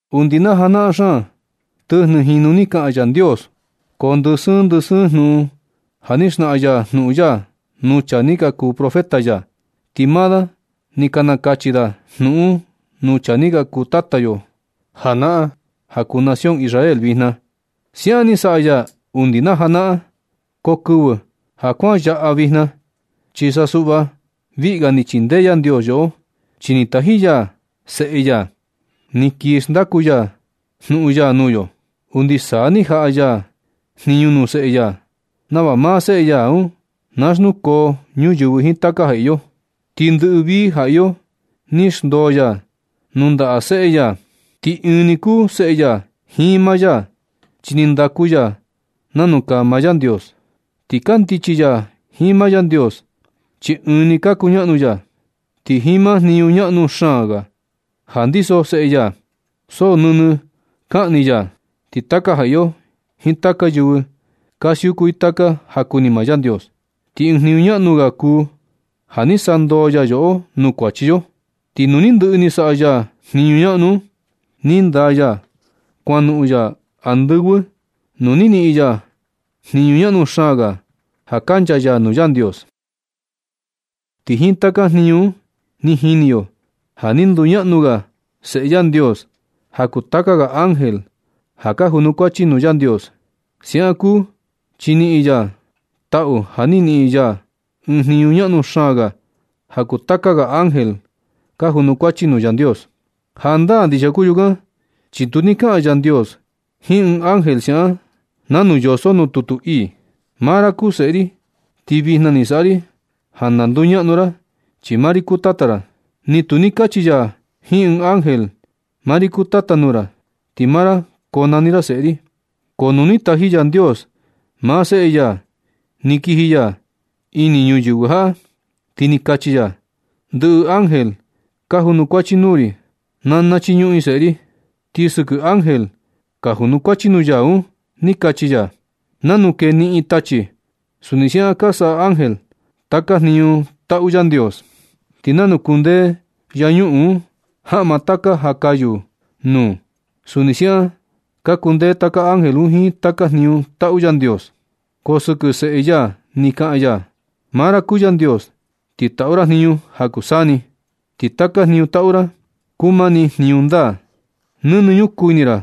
Undi na janaꞌan xaan, tɨjnɨ jinu ni kaꞌan Yandios, ko ndɨ sɨɨn ndɨ sɨɨn jnuꞌun ja ni xnaꞌan ya jnuꞌun ya nuu chaa ni ka kuu profeta ya. Ti maa da ni ka nakachi da jnuꞌun un nuu chaa ni ka kuu tata yo janaꞌan ja kuu nación Israel vijna. Siaꞌan ni saꞌa ya undi na janaꞌan. Ko kɨvɨ ja kuan yaꞌa vijna, chi sa suꞌva viꞌi ga ni chindee Yandios yoꞌo, chi ni taji ya Seꞌe ya ni kii xndaku ya jnuꞌun ya nuu yo. Undi saa ni jaꞌa ya jniñu nuu Seꞌe ya nava maa Seꞌe ya un na xnukoo ñuyɨvɨ jiin taka ja iyo. Ti ndɨꞌɨ vii ja iyo ni xndoo ya nuu ndaꞌa Seꞌe ya. Ti ɨɨn ni kuu Seꞌe ya jiin maa ya chi ni ndaku ya nanu kaa maa Yandios. Ti kandichi ya jiin maa Yandios, chi ɨɨn ni ka kuñaꞌnu ya. Ti jiin maa jniñu ñaꞌnu xaan ja ndiso Seꞌe ya, so nɨnɨ kaꞌan ni ya, ti taka ja iyo jiin taka yɨvɨ ka siuku i taka ja kuni maa Yandios. Ti ɨɨn jniñu ñaꞌnu ga kuu ja ni sandoo ya yoꞌo nuu kuachi yo. Ti nu ni ndɨꞌɨ ni saꞌa ya jniñu ñaꞌnu un, ni ndaa ya kuanoꞌon ya andɨvɨ nuu ni niꞌin ya jniñu ñaꞌnu xaan ga ja nchaa ya nuu Yandios. Ti jiin taka jniñu un ni jini yo ja ni nduñaꞌnu ga Seꞌe Yandios ja kuu taka ga ángel ja ka junukuachi nuu Yandios. Siaꞌan kuu chi ni niꞌin ya taꞌu ja ni niꞌin ya ɨɨn jniñu ñaꞌnu xaan ga ja kuu taka ga ángel ka junukuachi nuu Yandios. Jandaa ndixia kuu yukan chi tu ni kaꞌan Yandios jiin ɨɨn ánge siaꞌan nanu yoso nuu tutu ii: Maa ra kuu Seꞌe ri, ti vijna ni saꞌa ri ja na nduñaꞌnu ra, chi maa ri kuu Tata ra. Ni tu ni kachi ya jiin ɨɨn ángel: Maa ri kuu Tata nuu ra, ti maa ra konani ra Seꞌe ri. Ko nu ni taji Yandios maa Seꞌe ya ni kiji ya ini ñuyɨvɨ jaꞌa, ti ni kachi ya: Ndɨꞌɨ ángel ka junukuachi nuu ri, na nachiñuꞌun i Seꞌe ri. Ti sɨkɨ ángel ka junukuachi nuu ya un ni kachi ya: Nanu kee niꞌin tachi, suni siaꞌan ka saꞌa ángel taka jniñu taꞌu Yandios. Ti nanu kundee yañuꞌun un jaꞌma taka ja kayu nuu, suni siaꞌan ka kundee taka ángel un jiin taka jniñu taꞌu Yandios. Ko sɨkɨ Seꞌe ya ni kaꞌan ya: Maa ra kuu Yandios, ti taꞌu ra jniñu ja kuu saa ni. Ti taka jniñu taꞌu ra, kuu mani jniñu ndaa. Nɨnɨ ñukuu ini ra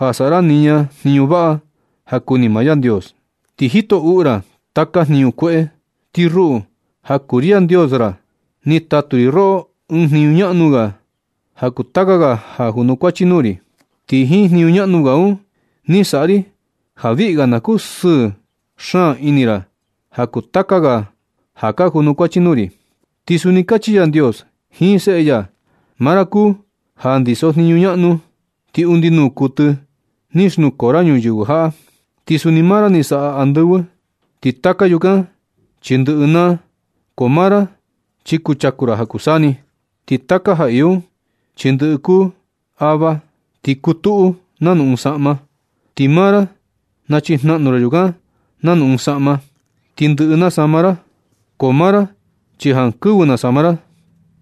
ja saꞌa ra niña jniñu vaꞌa ja kuni maa Yandios. Ti jito uꞌu ra taka jniñu kueꞌe. Ti ruꞌu, ja kuu ri Yandios ra, ni tatu ri roꞌo ɨɨn jniñu ñaꞌnu ga ja kuu taka ga ja ka junukuachi nuu ri. Ti jiin jniñu ñaꞌnu ga un ni saꞌa ri ja viꞌi ga na kusɨɨ xaan ini ra ja kuu taka ga ja ka junukuachi nuu ri. Ti suni kachi Yandios jiin Seꞌe ya: Maa ra kuu ja ndisojniñu ñaꞌnu, ti undi nuu kuɨtɨ ni xnukoo ra ñuyɨvɨ jaꞌa. Ti suni maa ra ni saꞌa andɨvɨ. Ti taka yukan chi ndɨꞌɨ naa. Ko maa ra chi kuchaku ra ja kuu saa ni. Ti taka ja iyo un chi ndɨꞌɨ kuu ava, ti kutuꞌu nanu ɨɨn saꞌma. Ti maa ra nachijnaꞌnu ra yukan nanu ɨɨn saꞌma, ti ndɨꞌɨ nasama ra. Ko maa ra chi jankɨvɨ nasama ra.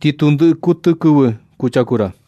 Ti tu ndɨꞌɨ kuɨtɨ kɨvɨ kuchaku ra.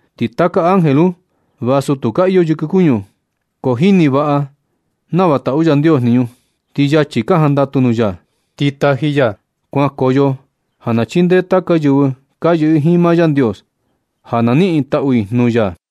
Ti taka ángel un vasu tu ka iyo yɨkɨ kuñu, ko jini vaꞌa nava taꞌu Yandios jniñu, ti yachi ka jandatu nuu ya. Ti taji ya kuankoyo ja na chindee taka yɨvɨ ka yɨꞌɨ jiin maa Yandios, ja na niꞌin i taꞌu i nuu ya.